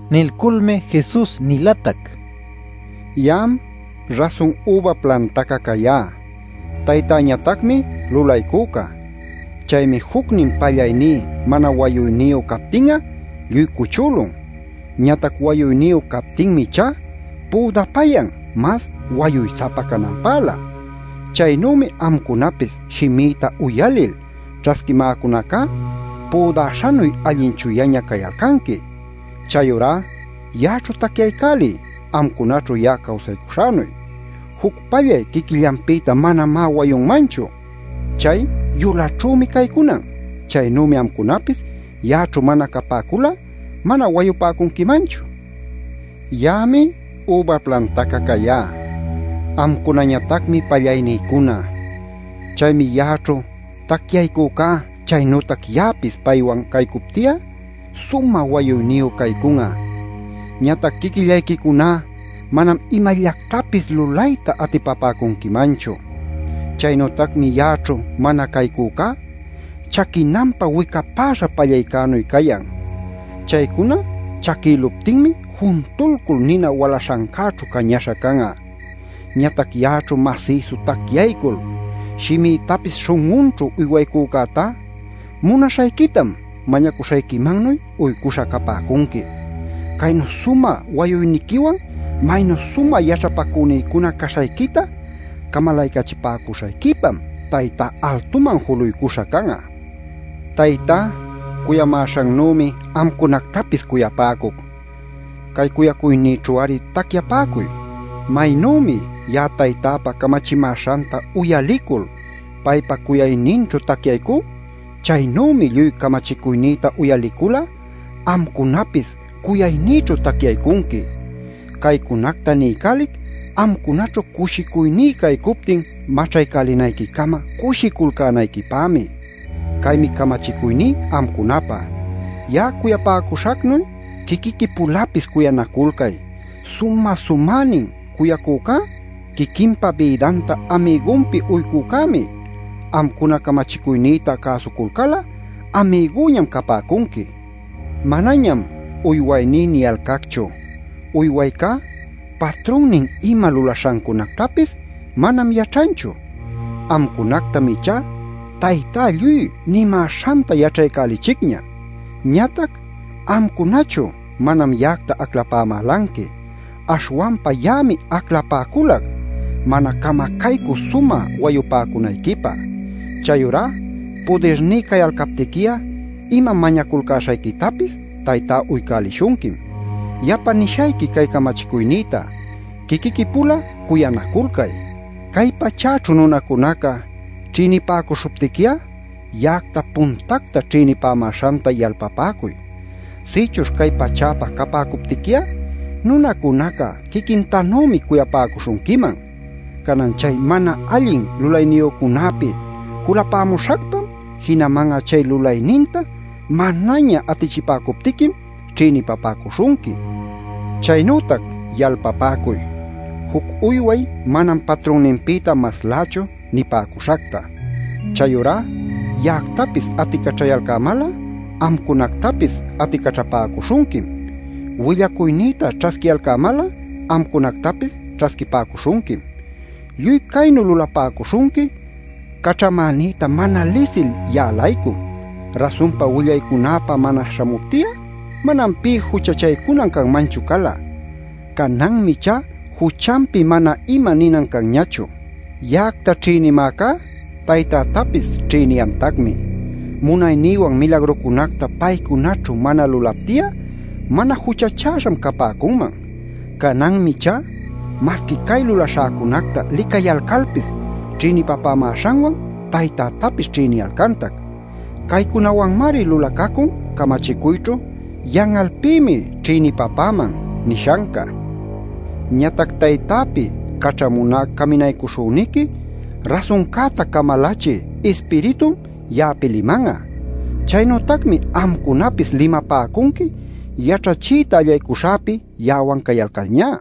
Nilculmi Jesus nilatac: “Ya'am rasun üba plantaca cayá; Taytäñatacmi lulaycüca. Chaymi jucnin pallayní mana wayuyniyu captin'a lluy cuchülun. Ñatac wayuyniyu captinmi ichá püdapayan mas wayuy-sapa cananpälä. Chaynümi amcunapis shimïta uyalil ćhasquimäcunacá, püdaśhanuy allin chuyaña cayalcanqui. Chayurá ya'aćhu tacyaycäliy amcunaćhu ya'a caycuśhänuy. Juc pallay quiquillanpïta manamá wayunmanchu. Chay yulaćhümi caycunan. Chaynümi amcunapis ya'aćhu mana capäcul'a mana wayupäcunquimanchu. “Ya'ami üba plantaca cayá; amcunañatacmi pallaynïcuna. Chaymi ya'aćhu tacyaycüca, chaynütac ya'apis paywan caycupti'a sumä wayuyniyu caycun'a. Ñatac quiquillayquicuná manam imallactapis lulayta atipapäcunquimanchu. Chaynütacmi ya'aćhu mana caycücá chaquinanpä wicapäśha pallaycänuy cayan. Chaycuna chaquïluptinmi juntulcul nina walaśhancäćhu cañaśha can'a. Ñatac ya'aćhu masïsu tacyaycul, shimïtapis śhun'unćhu uywaycücätá munaśhayquitam mañacuśhayquimannuy uycuśha capäcunqui. Caynu sumä wayuyniquiwan maynu sumä yaćhapacünïcuna caśhayquita camalaycachipäcuśhayquipam Taytá altuman juluycuśha can'a. “Taytá cuyamäśhannümi amcunactapis cuyapäcuc. Cay cuyacuynïćhu-ari tacyapäcuy. Maynümi ya'a Taytäpa camachimäśhanta uyalicul, paypa cuyayninćhu tacyaycú, chaynümi lluy camachicuynïta uyalicul'a amcunapis cuyaynïćhu tacyaycunqui. “Caycunacta niycälic amcunaćhu cushicuyní caycuptin maćhaycälälinayquicama cushiculcänayquipämi. Caymi camachicuyní amcunapä: Ya'a cuyapäcuśhacnuy quiquiqui-pulapis cuyanaculcay. Sumä-sumänin cuyaycücá quiquinpa bïdanta amigunpi uycücämi. Amcuna camachicuynïta cäsuculcal'a amigüñam capäcunqui. Manañam ‘uywayní’ niyalcacchu. Uywaycá patrunnin ima lulaśhancunactapis manam yaćhanchu. Amcunactam ichá Taytá lluy nimäśhanta yaćhaycälichicña. Ñatac amcunachu manam ya'acta aclapämälanqui, aśhwanpa ya'ami aclapäculac mana camacaycü sumä wayupäcunayquipä. Chayurá pudirní cayalcaptiqui'a ima mañaculcäśhayquitapis Taytá uycälishunquim. Yapa nishayqui cay camachicuynïta: quiquiqui-pula cuyanaculcay. “Cay pachäćhu nunacunaca ćhïnipäcuśhuptiqui'a ya'acta puntacta ćhïnipämäśhanta yalpapäcuy. Sïchuśh cay pachäpä capäcuptiqui'a nunacunaca quiquintanümi cuyapäcuśhunquiman. Canan chay mana allin lulayniyücunäpi julapämuśhacpam, jinaman'a chay lulayninta manaña atichipäcuptiquim ćhïnipapäcuśhunqui. Chaynütac yalpapäcuy ‘Juc uyway manam patrunninpïta maslächu’ nipäcuśhacta. Chayurá ya'actapis aticaćhayalcämal'a, amcunactapis aticaćhapäcuśhunquim. Willacuynïta ćhasquiyalcämal'a amcunactapis ćhasquipäcuśhunquim. Lluy caynu lulapäcuśhunqui caćhamänïta mana lisil ya'a-laycum. Rasunpa willaycunäpä mana śhamupti'a manam pï juchachaycunan canmanchu cala. Cananmi ichá juchanpi mana ima ninan canñachu. Ya'acta ćhïnimäcá Taytätapis ćhïniyantacmi. Munaynïwan milagrucunacta paycunaćhu mana lulapti'a mana juchachäśham capäcunman. Cananmi ichá masqui cay lulaśhäcunacta licayalcalpis ćhïnipapämäśhanwan Taytätapis ćhïniyalcantac. Caycunawanmari lulacacun camachicuyćhu ‘Yan'alpïmi ćhïnipapäman’ nishanca. “Ñatac Taytäpi caćhamuná Caminaycuśhüniqui, rasuncäta camalachï Ispiritum ya'api liman'a. Chaynütacmi amcunapis limapäcunqui yaćhachiyta allaycuśhäpi ya'awan cayalcalñá.